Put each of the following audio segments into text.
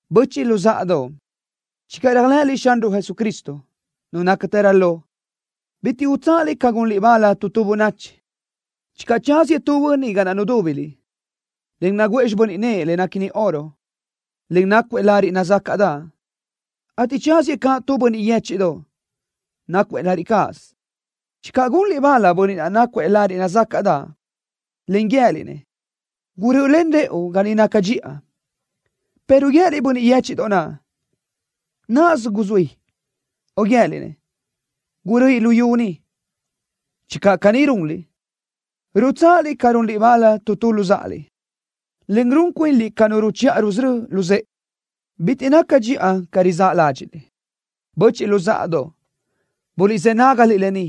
Böchiʼ luzáʼadoʼ, channö réajlëʼëliʼ Xanruʼ Jesucristo, Nu nácatërö lo, bitiʼ ral-laʼ utsáʼaliʼ ca gunliʼ bal tu tu bönachi. Channö tsáziëʼ tu bönniʼ ga naʼ nudúbiliʼ, en naguʼë xibö́n nëʼë le néquini oro, en nácuëʼ lariʼ nazácaʼdaʼ, ateʼ tsáziëʼ caʼ tu bönniʼ yéchiʼdoʼ, nácuëʼ lariʼ cáʼasö, channö gunliʼ bal bönniʼ naʼ nácuëʼ lariʼ nazácaʼdaʼ, en guië́liʼ-nëʼ: “Gurö́ʼölen rëʼu ga ni naca dxiʼa”, pero guië́liʼ bönniʼ yéchiʼdoʼ naʼ: “Náʼasö guzuí”, o guië́liʼ-nëʼ: “Guröʼi lu yu ni.” Channö caní runliʼ, rutsáʼaliʼ ca runliʼ bal tu tu luzáʼaliʼ, en run cuinliʼ ca nu ruchiʼa rusörö́ luzë́ʼe, bitiʼ naca dxiʼa ca rizáʼ ládxiʼliʼ. Böchiʼ luzáʼadoʼ, buliʼzë́ nágaliʼ lë ni.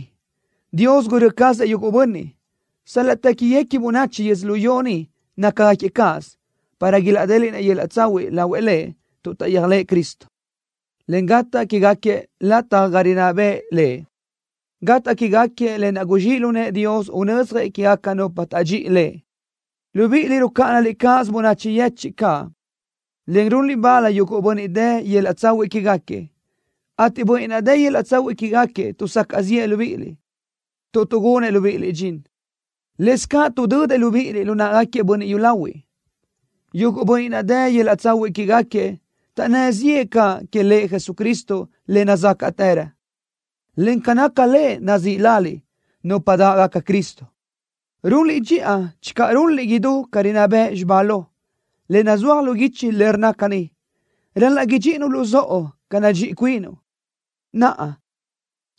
Dios gurö́ cazëʼ yuguʼ bönniʼ, sal-laʼ téquiguequi bönachi yödzölió ni nácagaquiëʼ cáʼasö, para ilaʼdéliʼnëʼ yöl-laʼ tsahuiʼ lahuëʼ Lëʼ tuʼ taʼyéajlëʼë Cristo, en gataʼ quégaquiëʼ lataj ga niʼ rinná bëʼë Lëʼ. Gataʼ quégaquiëʼ lë naʼ guzxíʼ lu nëʼë Dios unödzjëʼ quégaca nupa taʼdxíʼi Lëʼ. Libíʼiliʼ rucáʼanaliʼ cáʼasö bönachi yechiʼ caʼ, en runliʼ bal yuguʼ bönniʼ dë yöl-laʼ tsahuiʼ quégaquiëʼ, ateʼ bönniʼ naʼ dë yöl-laʼ tsahuiʼ quégaquiëʼ tuʼsacaʼ ziʼë libíʼiliʼ, tuʼ tuʼgunëʼ libíʼiliʼ dxin. Lëscaʼ tuʼdödëʼ libíʼiliʼ lu náʼagaquiëʼ bönniʼ yúlahuiʼ. Yuguʼ bönniʼ naʼ dë yöl-laʼ tsahuiʼ quégaquiëʼ taʼnnë́ ziʼë caʼ que Lëʼ Jesucristo le nazácaʼtërö, en ca naca Lëʼ nazíʼi laliʼ: “Nupa Dáʼgaca Cristo.” Runliʼ dxiʼa channö runliʼ idú ca rinná bëʼ xibá lo, le nazúaj lu guichi, en rnna caní: “Ral-laʼ idxíʼinuʼ luzóʼo ca nadxíʼi cuinuʼ.” Naʼa,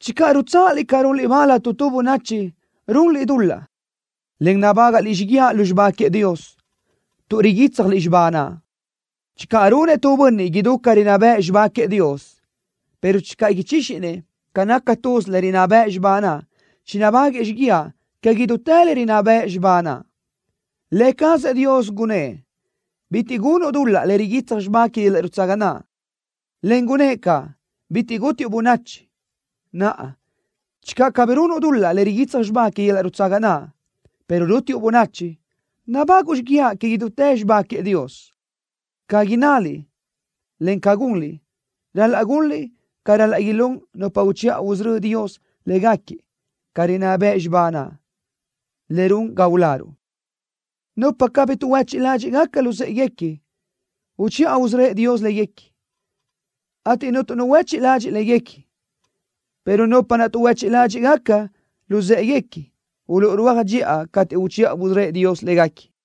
channö rutsáʼaliʼ ca runliʼ bal tu tu bönachi, runliʼ dul-laʼ, en nabágaʼliʼ xíguiaʼ lu xibá queëʼ Dios, tuʼ riguítsjaliʼ xibá naʼ. Channö runëʼ tu bönniʼ idú ca rinná bëʼ xibá queëʼ Dios, pero channö ichíxinëʼ ca naca tuz le rinná bëʼ xibá naʼ, chinabáguëʼë xíguiaʼ que idútë le rinná bëʼ xibá naʼ. Lë cazëʼ Dios gunnë́ʼ: “Bitiʼ gunuʼ dul-laʼ le riguitsaj xibá que yöl-laʼ nutsaga naʼ”, en gunnë́ʼ caʼ: “Bitiʼ gútiuʼ bönachi.” Naʼa, channö cabí runuʼ dul-laʼ le riguitsaj xibá que yöl-laʼ nutsaga naʼ, pero rútiuʼ bönachi, nabáguʼu xíguiaʼ que idútë xibá queëʼ Dios. Ca innaliʼ, en ca gunliʼ, ral-laʼ gunliʼ ca ral-laʼ ilún nupa uchiʼa usörö́ëʼ Dios légaquiëʼ ca rinná bëʼ xibá naʼ, le run ga uláruʼ. Nupa cabí tuʼhuechiʼ ládxiʼgaca luzë́ʼeguequi, uchiʼa usörö́ëʼ Dios léguequi, ateʼ cuntu nu huéchiʼ ladxiʼ léguequi, pero nupa naʼ tuʼhuechiʼ ládxiʼgaca luzë́ʼeguequi uluʼrúaj dxiʼa cateʼ uchiʼa usörö́ëʼ Dios léguequi.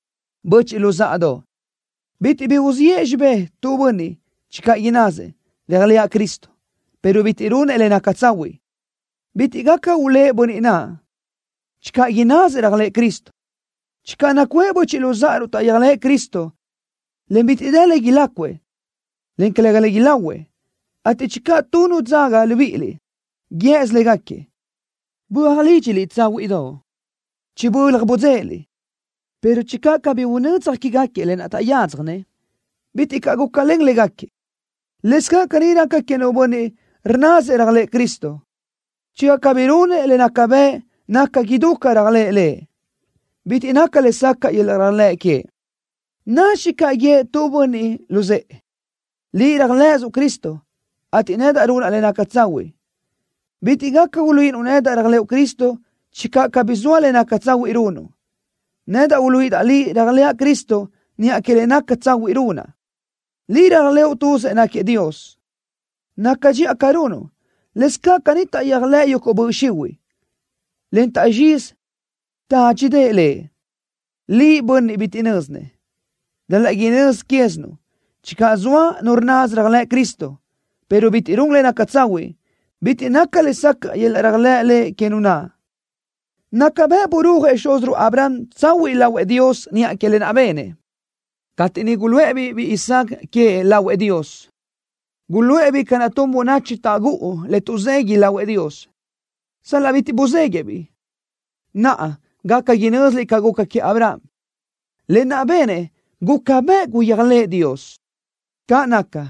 Böchiʼ luzáʼadoʼ, bitiʼ bi uziʼë xibé tu bönniʼ channö innasëʼ: “Réajlëʼa Cristo”, pero bitiʼ runëʼ le naca tsahuiʼ. Bitiʼ gaca ulë́ʼ bönniʼ naʼ channö innasëʼ réajlëʼë Cristo. Channö nacuʼë böchiʼ luzáʼaruʼ taʼyéajlëʼë Cristo, en bitiʼ dë le ilácuëʼ, en calëga le ilahuëʼ, ateʼ channö tu nu dzaga libíʼiliʼ guië́sö légaquiëʼ: “Böaj lídxiliʼ tsáhuiʼdoʼ. Chibölaj budzéʼeliʼ”, pero channö cabí unödzaj quégaquiëʼ lë naʼ taʼyádzjanëʼ, bitiʼ caʼ gúcalen légaquiëʼ. Lëscaʼ caní raca que nu bönniʼ rnnasëʼ réajlëʼë Cristo. Channö cabí runëʼ le naca bëʼ naca idú ca réajlëʼë Lëʼ, bitiʼ naca lesacaʼ yöl-laʼ réajlëʼ queëʼ. Nadxi caʼ guië́ʼ tu bönniʼ luzë́ʼë: “Liʼ réajlëʼësuʼ Cristo, ateʼ nedaʼ runaʼ le naca tsahuiʼ. Bitiʼ gaca uluíʼinuʼ nedaʼ réajlëʼu Cristo channö cabí zoa le naca tsahuiʼ runuʼ. Nedaʼ uluíʼidaʼ liʼ réajlëʼa Cristo niʼa que le naca tsahuiʼ runaʼ.” Liʼ réajlëʼu tuzëʼ náquiëʼ Dios. Naca dxiʼa ca runuʼ. Lëscaʼ caní taʼyéajlëʼ yuguʼ böʼ xihuiʼ, en taʼzxizi tádxidaʼ Lëʼ. Liʼ, bönniʼ bitiʼ bi nö́zinëʼ. Ral-laʼ inözi quézinuʼ channö zoa nu rnnasö réajlëʼ Cristo, pero bitiʼ run le naca tsahuiʼ, bitiʼ naca lesacaʼ yöl-laʼ réajlëʼ Lëʼ que nu naʼ. Naca bëʼ burúajëʼ xúziruʼ Abraham tsahuiʼ lahuëʼ Dios niʼa que lë naʼ benëʼ, cateʼ niʼ guluʼë-biʼ biʼi Isaac queëʼ lahuëʼ Dios. Guluʼë-biʼ ca naʼ tun bönachi taʼgúʼu le tuʼzeguiʼ lahuëʼ Dios, sal-laʼ bitiʼ buzéguiʼë-biʼ. Naʼa gaca inö́ziliʼ ca guca queëʼ Abraham. Lë naʼ benëʼ guca bëʼ guyéajlëʼë Dios. Caʼ naca,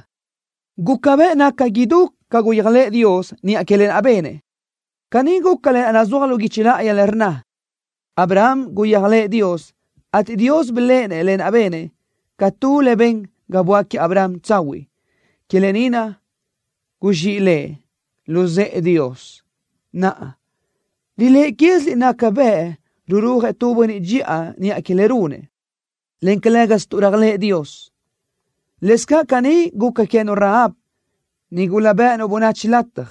guca bëʼ naca idú ca guyéajlëʼë Dios niʼa que lë naʼ benëʼ. Caní guca lë naʼ nazúaj lu guichi láʼayi le rnna: “Abraham guyéajlëʼë Dios, ateʼ Dios biléʼenëʼ lë naʼ benëʼ ca tu le ben ga böáquiëʼ Abraham tsahuiʼ.” Que lë ni naʼ guzxíʼi lëʼ: “Luzë́ʼë Dios.” Naʼa, riléʼe quéziliʼ naca bëʼ rurúajëʼ tu bönniʼ dxiʼa niʼa que le runëʼ, en calë́gasö tuʼ réajlëʼë Dios. Lëscaʼ caní guca queë́nu Rahab, nigula bë́ʼënu bönachi lataj.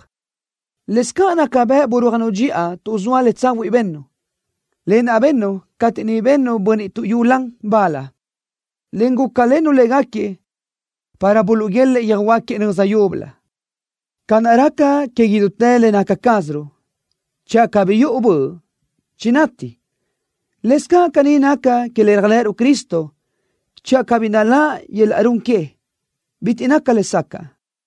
Lëscaʼ naca bëʼ burúajnu dxiʼa tuʼ zoa tu le tsahuiʼ bennu, lë naʼ bennu cateʼ niʼ bennu bönniʼ tuʼyulan bal, en gúcalennu légaquiëʼ para buluʼguélëʼë yöjhuö́jgaquiëʼ nöza yúbölö. Ca naʼ raca que idútë le naca cázaruʼ channö cabí yuʼu böʼ, chinati, lëscaʼ caní naca que le réajlëʼëruʼ Cristo channö cabí naláʼ yöl-laʼ run que, bitiʼ naca lesacaʼ.